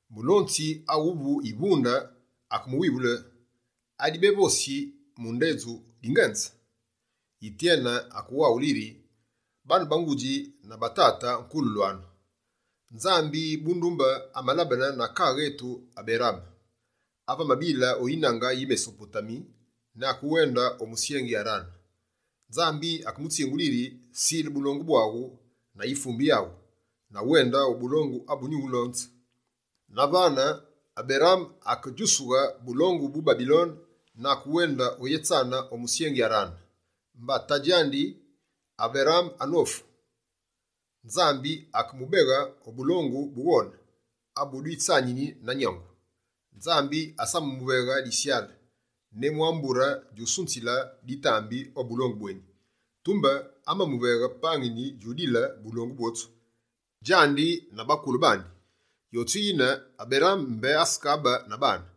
Mulonzi awuvu yivunde akemuwivule: «Adibevosi mu ndedju, dingenze?» Yityene akewaghule yiri: «Baane ba ngudji na batate nkululwanu, Nzambi bundumbe amalabene na kaaghe etu Aberaame, ave amabile o yinange yi Mesopotami ne akewende o musyengi Arane. Nzambi akemutsingule yiri: “Sile bulongu bwaghu na yifumbe yaghu, na wende o bulongu abu nyuwulase.” Na vane Aberaame akedjusughe bulongu bu Babilone na akewende oyétsane o musyengi Arane. Mba tadji Aberaame anofu, Nzambi akemubeghe o bulongu bughone abu dwitsanini na nyangu. Nzambi asamamuveghe disyale, ne mwa mbure djusunzile ditambi o bulongu bweni. Tumbe, amamuveghe pangini djudile bulongu bwotsu, djandi na bakule bandi. Yotsu yine, Aberaame mbé asekabe na baane.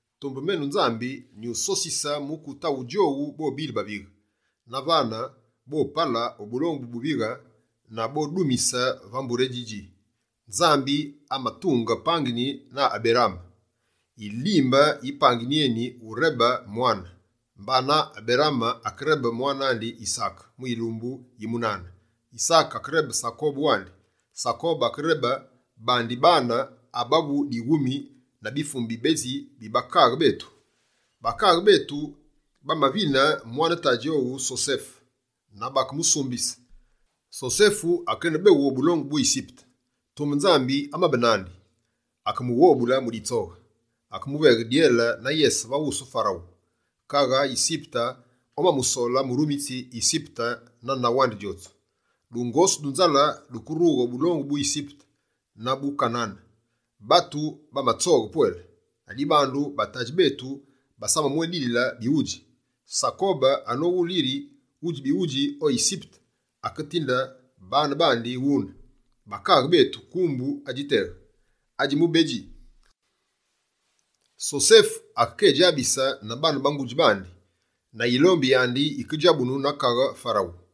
Tumbe menu Nzambi, nyusosise mukute awu djowu bobile bavighe. Na vane, bopale o bulongu bu buvighe, na bondumise va mbure eni djidji.” Nzambi amatunge pangini na Aberaame. Yilimbe yi pangini eni, urebe mwane. Mbana, Aberaame akerebe mwane andi Yisaake mu yilumbu yi munana. Yisake akerebe Sakobe wandi. Sakobe akerebe bandi baane, abavu dighumi na bifumbe bibedji bi bakaaghe betu. Bakaaghe betu bamavine mwane tadji owu Sosefe na bakemusumbise. Sosefe akenebeghu o bulongu bu Yisipete. Tumbe Nzambi amabe nandi. Akemughobule mu ditsoghe. Akemuveghe dyele na yese va wusu Farawu, kaghe Yisipete omamusole murumitsi Yisipete na ndaghu andi djotsu. Dungosu du nzale dukerughe o bulongu bu Yisipete na bu Kanane. Batu bamatsoghe pwele, ladibandu batadji betu basamamwédile bighudji. Sakobe anowulu yiri wudji bighudji o Yisipete, aketinde bane bandi wune, bakaaghe betu kumbu adji teghe. Adjimubedji, Sosefe akekedjabise na baane ba ngudji bandi. Na yilombi yandi yikedjabunu na Kaghe Farawu.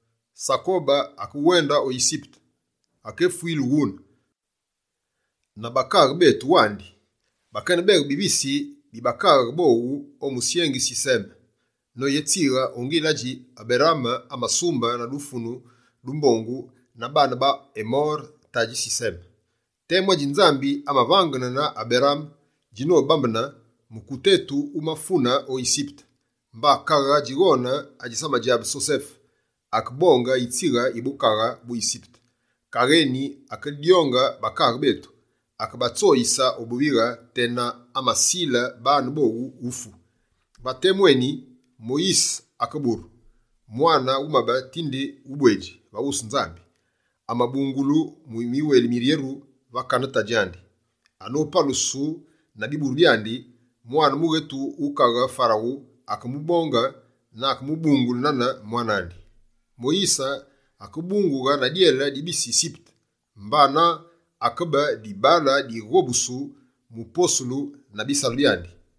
Sakobe akewende o Yisipete. Akefwile wune, na bakaaghe betu wandi. Bakenebeghe bivisi bi bakaaghe bowu o musyengi Siseme noyétsighe o ngile adji Aberaame amasumbe na dufunu du mbongu na baane ba Emore tadji Siseme. Temu adji Nzambi amavangene na Aberaame djinobambene, mukute etu wumafune o Yisipete. Mba kaghe djighone adjisamadjabe Sosefe, akebonge yitsighe yi bukaghe bu Yisipete. Kaghe eni akedyonge bakaaghe betu, akebatsoyise o buvighe, tena amasile bane bowu ufu. Va temu eni, Moyise akeburu, mwane wumabe tinde ubwedji va wusu Nzambi. Amabungulu mu miweli miryeru va kane tadji andi. Anopalusu na biburu byandi, mwane mughetu wu Kaghe Farawu akemubonge na akemubungule nane mwane andi. Moyise akebungulu na dyele di bise Yisipete, mbana akebe dibaale dighobusu mu posulu na bisalu byandi.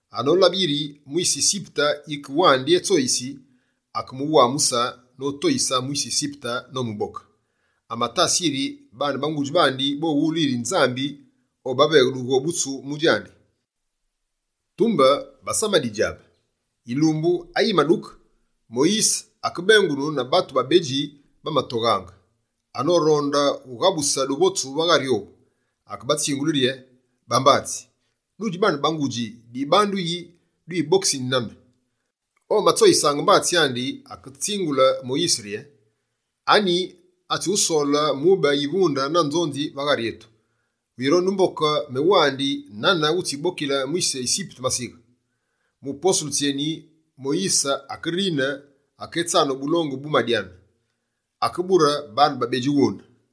Anolabe yiri mwise Yisipete yike wandi etsoyisi, akemuwamuse notoyise mwise Yisipete nomuboke. Amatase yiri baane ba ngudji bandi bowulu yiri Nzambi obaveghe dughobutsu mu djandi, tumbe basamadidjabe. Yilumbu ayimaduke, Moyise akebengune na batu babedji bamatoghaange. Anoronde ughabuse duvotsu va ghari owu, akebatsingule rye: “Bambatsi, dudji baane ba ngudji, dibandu yi dibokisini nane?” Omatsoyisaange mbatsi andi, akesindile Moyise novose: “Anyi atsyusole mube yivunde na nzonzi va ghari etu? Wirondi umboke menu wandi, nane wutsibokile mwise Yisipete masighe?” Mu posulu tsyeni, Moyise akerine, aketsane o bulongu bu Madyane. Akebure bane babedji wune.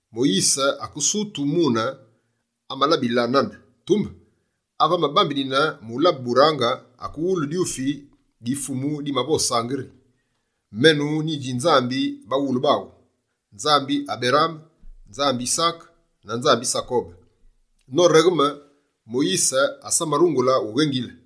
Moyise akesutu mune amalabile nane, tumbe ave amabambenine mu labe burange, akewulu dyufi di Fumu dimavosaange yi: “Menu nyidji Nzambi baghulu baghu, Nzambi Aberaame, Nzambi Yisaake na Nzambi Sakobe.” Noregheme, Moyise asamarungule ughengile.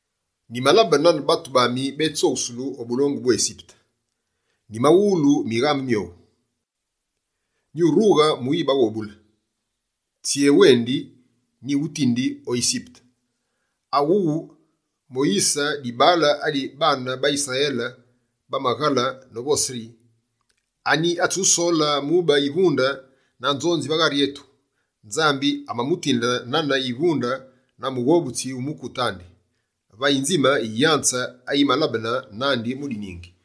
Nyimalabe nane batu bami bétsoghusulu o bulongu bu Yisipete. Nyimawulu mighamu myowu, nyirughe muyibaghobule. Tsyéwendi, nyiwutindi o Yisipete.” Awuwu, Moyise, dibaale adi baane ba Yisrayele bamaghale novose yi: “Anyi atsyusole mube yivunde na nzonzi va ghari etu?” Nzambi amamutinde nane yivunde na mughobutsi wu mukute andi, va yinzime yi yanze ayimalabene nandi mu diningi.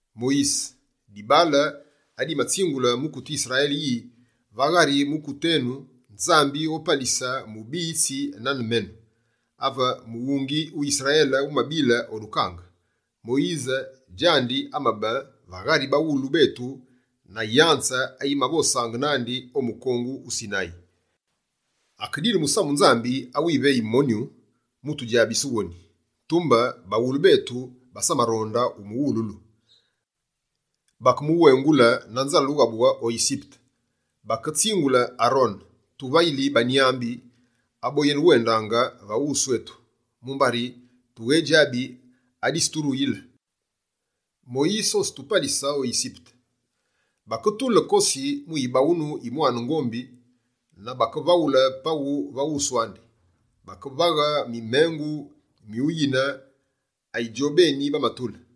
Moyise, dibaale adimatsingule mukute Yisrayele yi: “Va ghari mukute enu, Nzambi opalise mubiyitsi nane menu.” Ave mughungi wu Yisrayele wumabile o dukange, Moyise djandi amabe va ghari baghulu betu na yanze, ayimavosaange nandi o mukongu wu Sinayi. Akedile musamu Nzambi awiveyi monyu, mu tudjabise woni. Tumbe baghulu betu basamaronde umuwululu. Bakemuwengule na nzale ughabughe o Yisipete. Baketsingule Arone: “Tuvayili banyambi aboyenewendaange va wusu etu, mumbari tughedjabi aditsiruyile Moyise, otsitupalise o Yisipete.” Baketule kosi mu yibaghunu yi mwane ngombi na bakevaghule paghu va wusu andi. Bakevaghe mumengu mu yime ayi djobeni bamatule.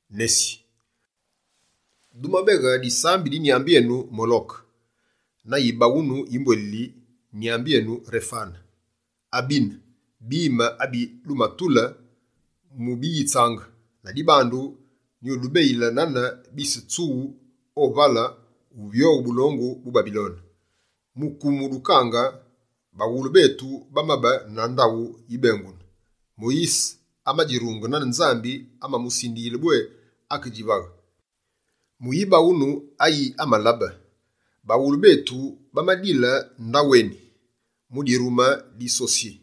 Nesi, dumabeghe disambe di nyambi enu Moloke, na yibaghunu yi mbwelili nyambi enu Refane. Abine, bime abi dumatule mu biyitsaange. Ladibandu, nyudubeyile nane bise tsughu o vale, uvyoghe bulongu bu Babilone.” Mu kumu dukange, baghulu betu bamabe na ndaghu yibengunu. Moyise amadjirunge nane Nzambi amamusindiyile bwé akedjivaghe, mu yibaghunu ayi amalabe. Baghulu betu bamadile ndaghu eni. Mu dirume di Sosye,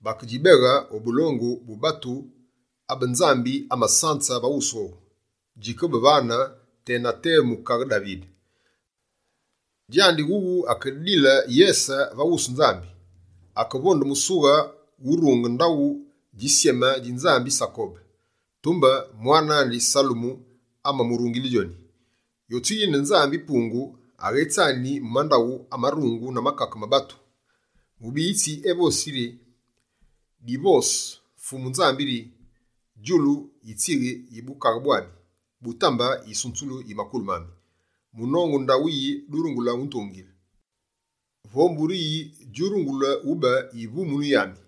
bakedjibeghe o bulongu bu batu abe Nzambi amasanze va wusu owu. Djikebe vane tena temu kaghe Davide. Djandi wughu akedile yese va wusu Nzambi. Akevonde musughe wurunge ndaghu djisyeme dji Nzambi Sakobe. Tumbe mwane andi Salemu amamurungile djoni. Yotsu yine Nzambi-Pungu, aghétsani mu mandaghu amarungu na makake ma batu. Mubiyitsi evosi yi: “Divose Fumu Nzambi rye: Djulu yitsighe yi bukaghe bwami, Butambe yisunzulu yi makulu mami. Munongu ndaghu yi durungule utungile? Vo mbure yi djurungule ube yivumunu yami?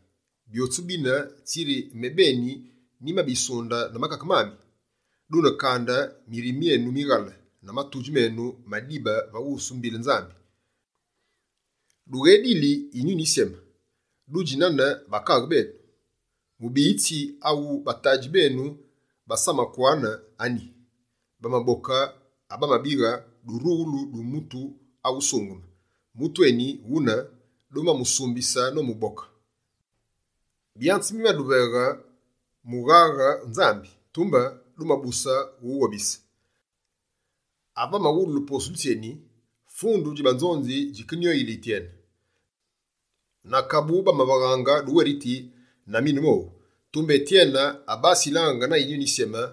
Byotsu bine, tsiri mebeni nyimabisunde na makake mami?” Dune kande, mirime myenu mighale na matudji menu madibe va wusu mbile Nzambi! Dughededili Yinyuni Yisyeme! Dudji nane bakaaghe benu. Mubiyitsi awu batadji benu basamakwane anyi? Bamaboke abamabighe durughulu du Mutu awusungeme. Mutu eni wune, dumamusumbise nomuboke. Byanze bimaduveghe mughaghe Nzambi, tumbe dumabuse uwughobise!» Ave bamawululu posulu tsyeni, fundu dji banzonzi djikenyoyile Yityene. Na kabu, bakevaghaange duweriti na minu mowu. Tumbe Yityene, abasilange na Yinyuni Yisyeme,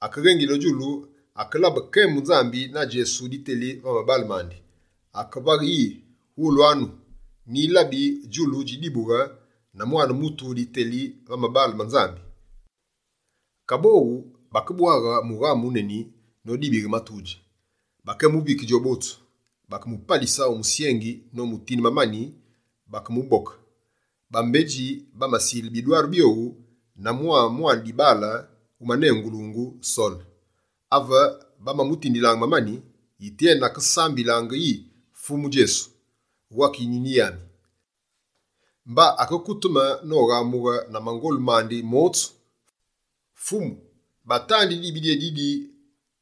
akeghengile o djulu, akelabe kembu Nzambi na Djesu diteli va mabaale mandi. Akevaghe yi: «Wulwanu, nyilabi djulu djidibughe na Mwane mutu diteli va mabaale ma Nzambi!» Kaboghu, bakebwaghe mughamu wuneni nodibighe matudji. Bakeyémuvike djowu botsu. Bakemupalise o musyengi nomutinde mamani bakemuboke. Bambedji bamasile bidwaru byowu na mwa mwane dibaale, wumanengulungu Sole. Ave bamamutindilaange mamani, Yityene akesambilaange yi: «Fumu Djesu, wake yinyuni yami!» Mba akekuteme noghamughe na mangolu mandi motsu: «Fumu, batandi dibi dyédidi!»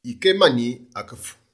Yikemani, akefu.